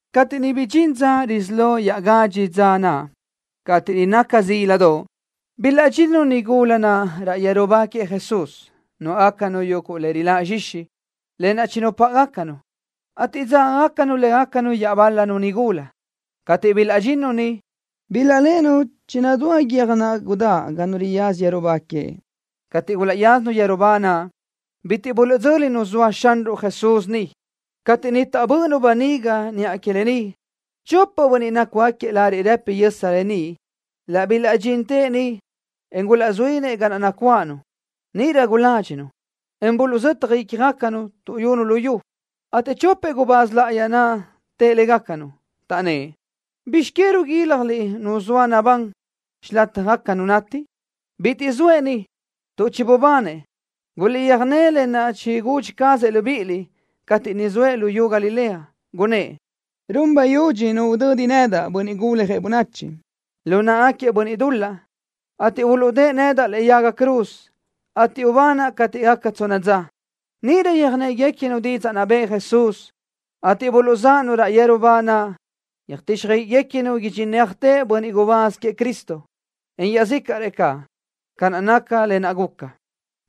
Cateʼ bidxín dza risí lo iaʼgadxi dza naʼ, cateʼ niʼ naca zíladoʼ, bilaʼdxinnu nigula naʼ raʼ yeru ba queëʼ Jesús. Nuáʼgacanu yuguʼ le riláʼ zxixi, lë naʼ chinupáʼagacanu, ateʼ dzágagacanu légacanu iaʼbál-lanu nigula. Cateʼ bilaʼdxinnu niʼ, bilaʼléʼenu chinadúa guiö́j naʼ gudáʼ ga nu riyaza yeru ba queëʼ. Cateʼ gulaʼyázanu yeru ba naʼ, bitiʼ buluʼdzö́linu zoa Xanruʼ Jesús niʼ. Cateʼ niʼ taʼbö́ʼönu böniga niʼa que lë ni, chopëʼ bönniʼ nácugaquiëʼ lariʼ rëpi yösa beníʼ laʼ bilaʼdxintëʼ niʼ, en gulaʼzuínëʼ ga naʼ nacuáʼanu. Níʼirö guládxinu, en buluʼzötaj ícjagacanu, tuʼyunu lu yu, ateʼ chopëʼ gubáz láʼayi naʼ tëʼ légacanu, taʼnnë́ʼ: —¿Bizx que ruguílajliʼ nu zoa nabán xilataj nu nati? Bitiʼ zoëʼ ni, tuʼ chibubanëʼ. Guliʼtsöjné lë naʼ chigudxi cazëʼ libíʼiliʼ cateʼ niʼ zoëʼ luyú Galilea. Gunnë́ʼ: “Run bayudxi nu udödi nedaʼ, Bönniʼ Guljëʼ Bönachi, lu náʼagaquiëʼ bönniʼ dul-laʼ, ateʼ uluʼdë́ʼë nedaʼ lëʼe yaga cruz, ateʼ ubanaʼ cateʼ gaca tsonna dza.” Níʼirö yöjnégacanu didzaʼ naʼ bëʼë Jesús, ateʼ buluʼzáʼanu raʼ yeru ba naʼ, yöjtíxjöiʼiguequinu idxinéajtëʼ bönniʼ gubáz queëʼ Cristo, en iaʼzícaʼrëʼ caʼ, ca naca lë naʼ guca.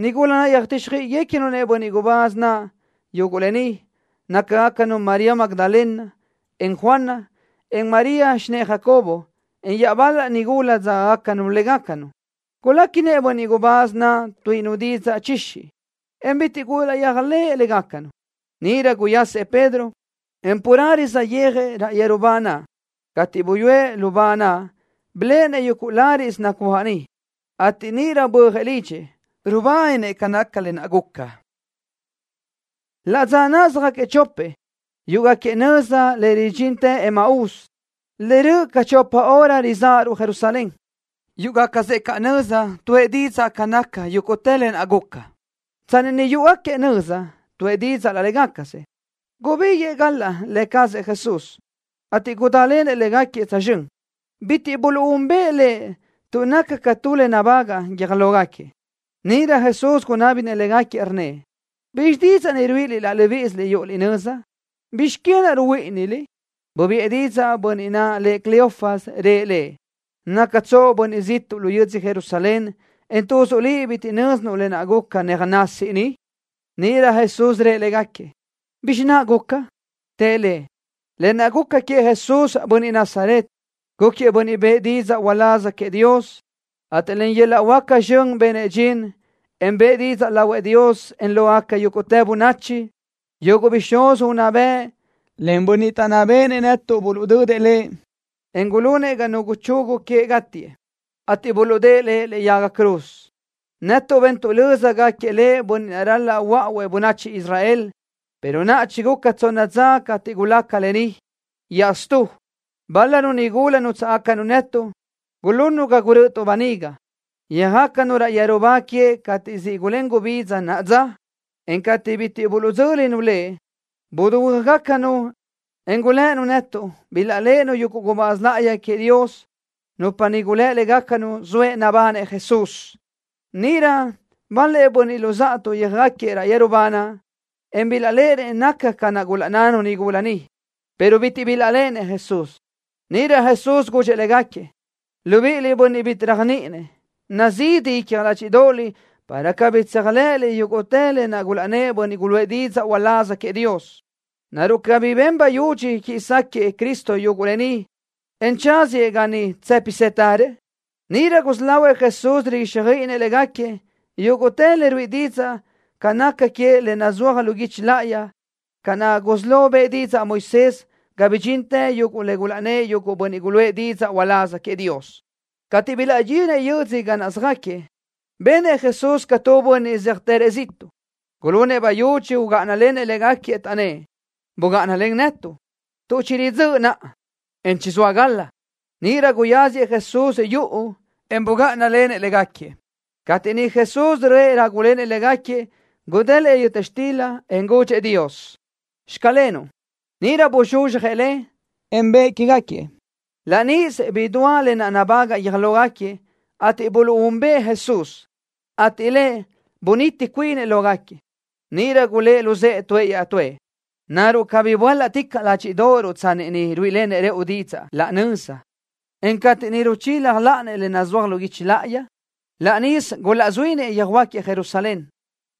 Nigula naʼ yöjtíxjöiʼiguequinu bönniʼ gubáz naʼ yuguʼ lë ni, nácagacanu María Magdalena, en Juana, en María, xinë́ʼë Jacobo, en iaʼbál-lanu nigula naʼ dzágagacanu légacanu. Guléquinëʼ bönniʼ gubáz naʼ tuíʼinu didzaʼ chixi, en bitiʼ gulaʼyéajlëʼë légacanu. Níʼirö guyasëʼ Pedro, en carelö saʼyéajëʼ raʼ yeru ba naʼ. Cateʼ buyúëʼ lu ba naʼ, biléʼenëʼ yuguʼ láriʼsö nacuáʼ niʼ, ateʼ níʼirö bö́ajëʼ lidxëʼ, rubáninëʼ ca naca lë naʼ guca. Laʼ dza náʼasö söjáquiëʼ chopëʼ, yúʼugaquiëʼ nöza le ridxintë Emaús, le röʼö ca chopa hora rizáʼaruʼ Jerusalén. Yúʼugacasëʼ caʼ nöza, tuʼë didzaʼ ca naca yúguʼtë lë naʼ guca. Tsanni niʼ yúʼugaquiëʼ nöza, tuʼë didzaʼ laʼ légacasëʼ, gubíguiʼë galaʼ Lë cazëʼ Jesús, ateʼ gudálenëʼ légaquiëʼ tsözxö́n. Bitiʼ buluʼúnbëʼë Lëʼ tuʼ naca ca tu le nabagaʼ guiö́j lógaquiëʼ. Níʼirö Jesús gunábinëʼ légaquiëʼ, rnnëʼ: —¿Bizxi didzaʼ naʼ ruíʼiliʼ laʼ libíʼisiliʼ yúʼuliʼ nöza? ¿Bizx que naʼ ruhuíʼiniliʼ? Bubiʼë didzaʼ bönniʼ naʼ lëʼ Cleofas, rëʼ Lëʼ: —¿Nácatsoʼ bönniʼ ziʼtuʼ lu yödzö Jerusalén, en tuzuʼ liʼ bitiʼ nö́zinuʼ lë naʼ guca néaje nasi niʼ? Níʼirö Jesús rëʼ légaquiëʼ: —¿Bizxi naʼ guca? Tëʼ Lëʼ: —Lë naʼ guca queëʼ Jesús, bönniʼ Nazaret. Gúquiëʼ bönniʼ bëʼë didzaʼ uláz queëʼ Dios, ateʼ len yöl-laʼ huáca zxön benëʼ dxin, en bëʼë didzaʼ lahuëʼ Dios, en lógaca yúguʼtë bönachi. Yuguʼ bixúz unná bëʼ, len bönniʼ taʼnná béʼenëʼ netuʼ buluʼdödëʼ Lëʼ, en gulunëʼ ga nu guchugu queëʼ gátiëʼ, ateʼ buluʼdë́ʼë Lëʼ lëʼe yaga cruz. Netuʼ bentuʼ löza gúquiëʼ Lëʼ bönniʼ naʼ ral-laʼ huöáʼuëʼ bönachi Israel, pero naʼa chiguca tsonna dza cateʼ gulaca lë ni. Iaʼstú, bál-lanu nigula nútsaʼgacanu netuʼ gulunnu ga gurö́ʼötuʼ böniga. Yöjácanu raʼ yeru ba queëʼ cateʼ siʼ gulén gubidza naʼa dza, en cateʼ bitiʼ buluʼdzö́linu Lëʼ, buduhuö́jgacanu, en gulënu netuʼ bilaʼléʼenu yuguʼ gubáz láʼayi queëʼ Dios, nupa niʼ gulë́ légacanu zoëʼ nabanëʼ Jesús. Níʼirö bal-lëʼ bönniʼ luzáʼatuʼ yöjáquiëʼ raʼ yeru ba naʼ, en bilaʼléʼenëʼ naca ca naʼ gulaʼnnanu nigula naʼ, pero bitiʼ bilaʼléʼenëʼ Jesús. Níʼirö Jesús gudxëʼ légaquiëʼ: —Libiʼiliʼ, bönniʼ bitiʼ réajniʼininëʼ. Nazidi icja ládxiʼdoʼoliʼ para cabí tséajlëʼëliʼ yúguʼtë le gulaʼnnë́ʼ bönniʼ guluʼë didzaʼ uláz queëʼ Dios. ¿Naruʼ cabí ben bayudxi quiʼi sáquëʼë Cristo yuguʼ lë ni, en tsáziëʼ ga niʼ tsë́pisëtërëʼ? Níʼirö gusí lahuëʼ Jesús riguíxjöiʼinëʼ légaquiëʼ yúguʼtë le ruíʼi didzaʼ ca naca queëʼ le nazúajgaca lu guichi láʼayi, ca naʼ gusí lo bëʼë didzaʼ Moisés ga bidxintë yuguʼ le gulaʼnnë́ʼ yúguʼtë bönniʼ guluʼë didzaʼ uláz queëʼ Dios. Cateʼ bilaʼdxinëʼ yö́dzödoʼ ga naʼ söjáquiëʼ, benëʼ Jesús ca tu bönniʼ zéajtërëʼ ziʼtuʼ. Gulunëʼ bayudxi ugáʼanalenëʼ légaquiëʼ, taʼnnë́ʼ: —Bugáʼanalen netuʼ, tuʼ chiridzö́ʼ naʼa, en chizóa gal-la. Níʼirö guyáziëʼ Jesús yuʼu, en bugáʼanalenëʼ légaquiëʼ. Cateʼ niʼ Jesús röʼë rágulenëʼ légaquiëʼ, gudélëʼë yöta xtila, en gudxëʼ Dios: “Xclenuʼ.” Níʼirö buzxuzxjëʼ le, en bëʼë quégaquiëʼ. Laʼ níʼisö bidúa lë naʼ gubagaʼ guiö́j lógaquiëʼ, ateʼ buluʼúnbëʼë Jesús, ateʼ Lëʼ buniti cuinëʼ lógaquiëʼ. Níʼirö gulë́ luzë́ʼë tuëʼ iaʼtúëʼ: —¿Naruʼ cabí böálaʼticaʼ ládxiʼdoʼoruʼ tsanni niʼ ruíʼilenëʼ rëʼu didzaʼ laʼ nöza, en cateʼ niʼ ruchila láʼaniëʼ le nazúaj lu guichi láʼayi? Laʼ níʼisö gulaʼzuínëʼ yöjhuö́jgaquiëʼ Jerusalén,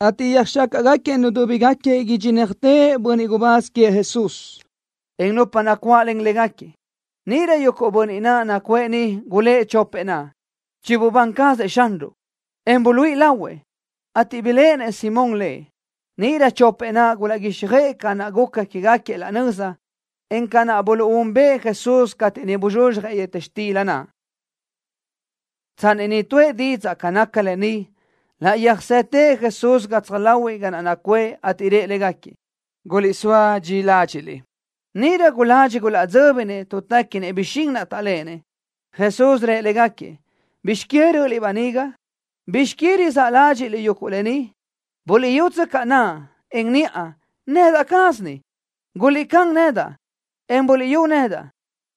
ateʼ yöjxácaʼgaquiëʼ nudúbigaquiëʼ idxinéajtëʼ bönniʼ gubáz queëʼ Jesús, en nupa nacuáʼlen légaquiëʼ. Níʼirö yuguʼ bönniʼ naʼ nacuʼë niʼ gulë́ʼ chopëʼ naʼ: —Chibubán cazëʼ Xanruʼ, en buluíʼi lahuëʼ, ateʼ biléʼenëʼ Simón Lëʼ. Níʼirö chopëʼ naʼ gulaʼguíxjöʼë ca naʼ guca quégaquiëʼ laʼ nöza, en ca naʼ buluʼúnbëʼë Jesús cateʼ niʼ buzxuzxjëʼ yöta xtila naʼ. Tsanni niʼ tuʼë didzaʼ ca nácagaca lë ni, laʼ yöjsóatëʼ Jesús gatsaj láhuiʼlö ga naʼ nacuʼë, ateʼ rëʼ légaquiëʼ: —Guliʼsóa dxi ládxiʼliʼ. Níʼirö guladxi gulaʼdzö́binëʼ tuʼ téquinëʼ bixín taʼléʼenëʼ. Jesús rëʼ légaquiëʼ: —¿Bizx que rö́ʼöliʼ böniga? ¿Bizx que rizáʼ ládxiʼliʼ yuguʼ lë ni? Buliʼyútsöcaʼ naʼa, en niʼa. Nedaʼ caz ni. Guliʼcán nedaʼ, en buliʼyú nedaʼ,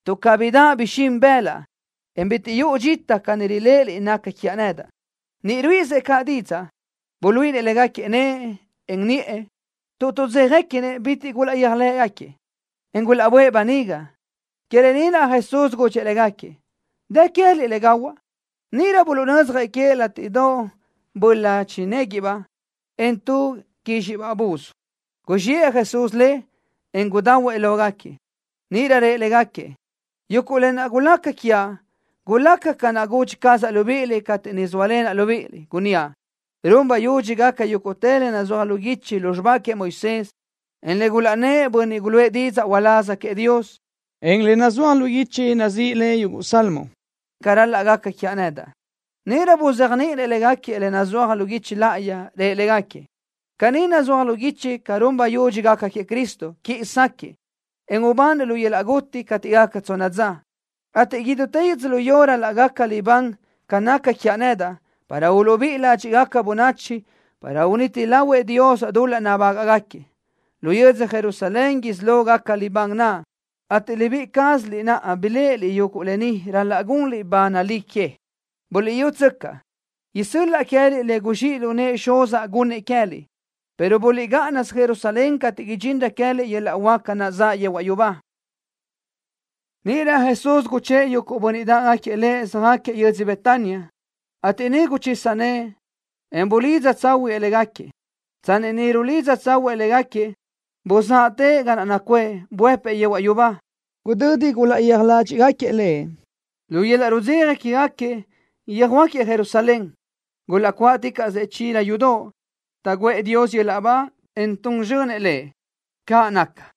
tuʼ cabí daʼ bixín bëlaʼ, en bitiʼ yuʼu dxita ca ni riléʼeliʼ naca quiaʼ nedaʼ. Niʼ ruíʼisëʼ caʼ didzaʼ ni, buluíʼinëʼ légaquiëʼ nëʼë, en niʼë. Tuʼ tuʼdzéjaguequinëʼ bitiʼ gulaʼyéajlëʼë, en gulaʼböʼë baniga. Que lë ni naʼ Jesús gudxëʼ légaquiëʼ: —¿Dë queë́liʼ ni le gahuaʼ? Níʼirö buluʼnödzjëʼ queëʼ látiʼdoʼobaʼ böla chinéguiʼbaʼ, en tu quízxiʼbaʼ buz. Guzxiʼë Jesús le, en gudahuëʼ lógaquiëʼ. Níʼirö rëʼ légaquiëʼ: —Yúguʼ lë naʼ gulaca quiaʼ gulaca ca naʼ gudxi cazaʼ libíʼiliʼ cateʼ niʼ zóalenaʼ libíʼiliʼ, gunníaʼ: Run bayudxi gaca yúguʼtë le nazúaj lu guichi lu xibá queëʼ Moisés, en le gulaʼnnë́ʼ bönniʼ guluʼë didzaʼ uláz queëʼ Dios, en le nazúaj lu guichi nazíʼi le Yuguʼ Salmo, ca ral-laʼ gaca quiaʼ nedaʼ. Níʼirö buzéajniʼinëʼ légaquiëʼ lë naʼ nazúajgaca lu guichi láʼayi. Rëʼ légaquiëʼ: —Caní nazúaj lu guichi ca run bayudxi gaca queëʼ Cristo, quiʼi sáquëʼë, en ubanëʼ lu yöl-laʼ guti cateʼ gaca tsonna dza, ateʼ idútë yödzölió ral-laʼ gaca libán ca naca quiaʼ nedaʼ para uluʼbíʼi ládxiʼgaca bönachi para uniti lahuëʼ Dios dul-laʼ nabágaʼgaquiëʼ. Lu yödzö Jerusalén isí lo gaca libán naʼ ateʼ libíʼi cázaliʼ naʼ biléʼeliʼ yuguʼ lë ni ral-laʼ gunliʼ ba nalí que. Buliʼyútsöcaʼ, isö́l-laʼa queë́liʼ le guzxíʼ lu nëʼë Xuzaʼ gunnëʼ queë́liʼ, pero buliʼgáʼanasö Jerusalén cateʼ idxinrö queë́liʼ yöl-laʼ huáca naʼ zaʼ yehuaʼ yubá. Níʼirö Jesús guchë́ʼë yuguʼ bönniʼ dáʼgaquiëʼ Lëʼ, söjáquiëʼ yödzö Betania, ateʼ niʼ guchisa nëʼë, en bulidza tsáhuëʼë légaquiëʼ. Tsanni niʼ rulidza tsáhuiʼsëʼ caʼ légaquiëʼ, buzáʼatëʼ ga naʼ nacuʼë, buëpëʼ yehuaʼ yubá. Gudödi gulaʼyéaj ládxiʼgaquiëʼ Lëʼ, lu yöl-laʼ rudzeja quégaquiëʼ yöjhuö́jgaquiëʼ Jerusalén. Gulaʼcuáʼticaʼsëʼ chila yudoʼ, taʼguʼë Dios yöl-laʼ ba, en tun zxönëʼ Lëʼ. ¡Caʼ naca!